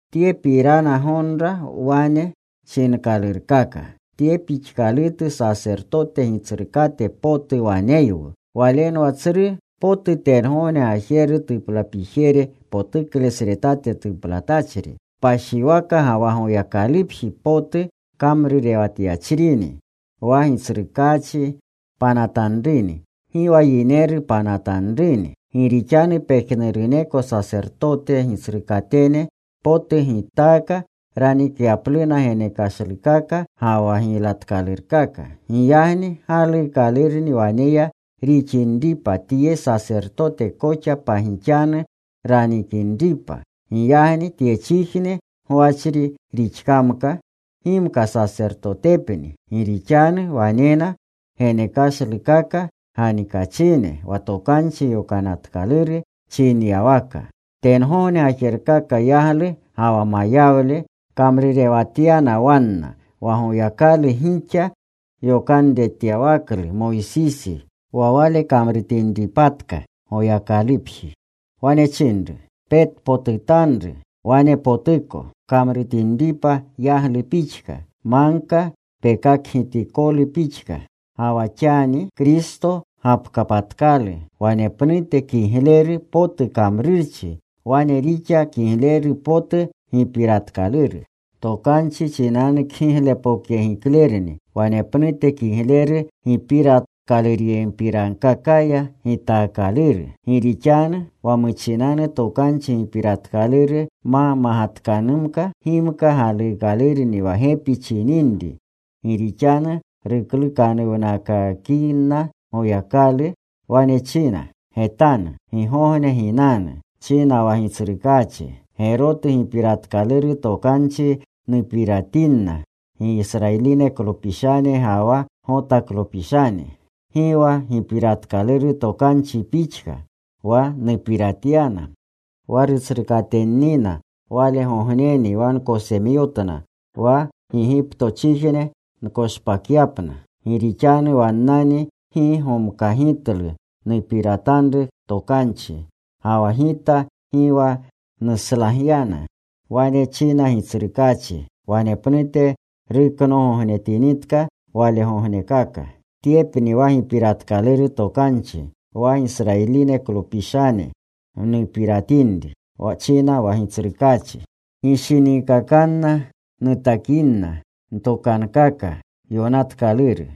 Tyepirana gonra wane chinkalurkaka: Tye pixkalutu sasertote Gitsrukate potu waneywu. Walenwa tsru potu tengogne gajeru tuplapijere potuklesretate tuplatachri. Kpashiwaka ga wa Goyakalupji potu kamrurewatyachrini, wa Gitsrukaachi panatanruni. Gi wa yineru panatanruni. Gi rixanu pejnuruneko sasertote gitsrukatene potu gitaaka ranikyapluna genekashlukaka ga wa giylatkalurkaka. Giyagni galuukalurni waneya rixinripa tye Sasertote koxa pagixanu ranikinripa. Giyagni tyechijne gwachri rixkamka, gimka sasertotepni, gi rixanu wanena genekashlukaka ganikachine wa Tokanchi Yokanatkaluru chinyawaka. Tengogne gajerkaka yaglu ga wa mayawle kamrurewatyana wanna, wa Goyakalu gixa yokanretyawaklu Moysisi, wa wale kamrutinripatka Goyakalupji. Wane chinru: “Petpotutanru, wanepotuko pkamrutinripa yaglu pixka, magka pekakgitikolu pixka.” Ga wa xani Kristo gapkapatkalu wanepnute kigleru potu kamrurchi, wane rixa kigleru potu Gipiratkaluru Tokanchi chinanu kgiglepokyegiklerni. Wanepnute kigleru gipiratkalurkakapiranaya gitaakaluru. Gi rixanu wa muchinanu Tokanchi Gipiratkaluru ma magatkanumka, gimka galuukalurni wa gepi chininri. Gi rixanu ruklukanuwnakakinna, Goyakalu wane china: “Getanu. Gigogne ginanu,” china wa Gitsrukaachi, “Gerotu gipiratkaluru tokanchi nupiratinna Gisrayiliklopishane ga wa Gotaklopishane.” “Gi wa gipiratkaluru tokanchi pixka Wa nupiratyana wa rutsrukatennina Walegogneni wa nkosemyomtna wa Gigiptochijne nkoshpakyapna. Gi rixanu wannani gi gomkagitlu nupiratanru tokanchi. Ga wa Gita gi wa nuslagyana,” wane china Gitsrukaachi. “Wanepnute ruknoogognetinitka walegognekaka, tyepni wa gipiratkaluru tokanchi, wa Gisrayiliklopishane nupiratinri,” china wa Gitsrukaachi. “Ginshinikanna nutakinna ntokankaka yokanatkaluru.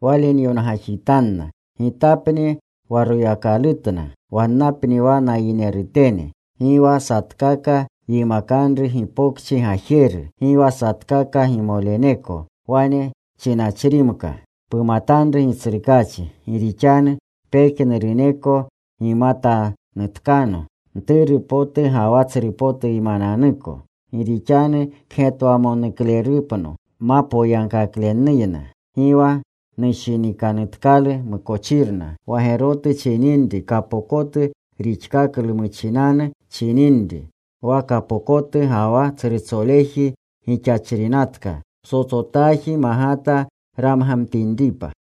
Wale nyongajitanna. Gitapni wa Royakalutna. Wannapni wa nayinerutene.” “Gi wa satkaka yimakanru gipokchi gajeru, Gi wa satkaka gimoleneko, wane chinachrimka, ‘Pumatanru Gitsrukaachi’. Gi rixanu pejnuruneko gimatanutkano, mturu potu ga wa tsrupotuymananuko. Gi rixanu kgetwamonuklerupno ma poyagkaklewleyna. Gi wa nushinikanutkalu mukochirna.” Wa gerotu chininri, kapokotu rixkaklu muchinanu chininri. Wa kapokotu ga wa tsrutsoleji gixachrinatka psotsotaji magata ramgamtinripa.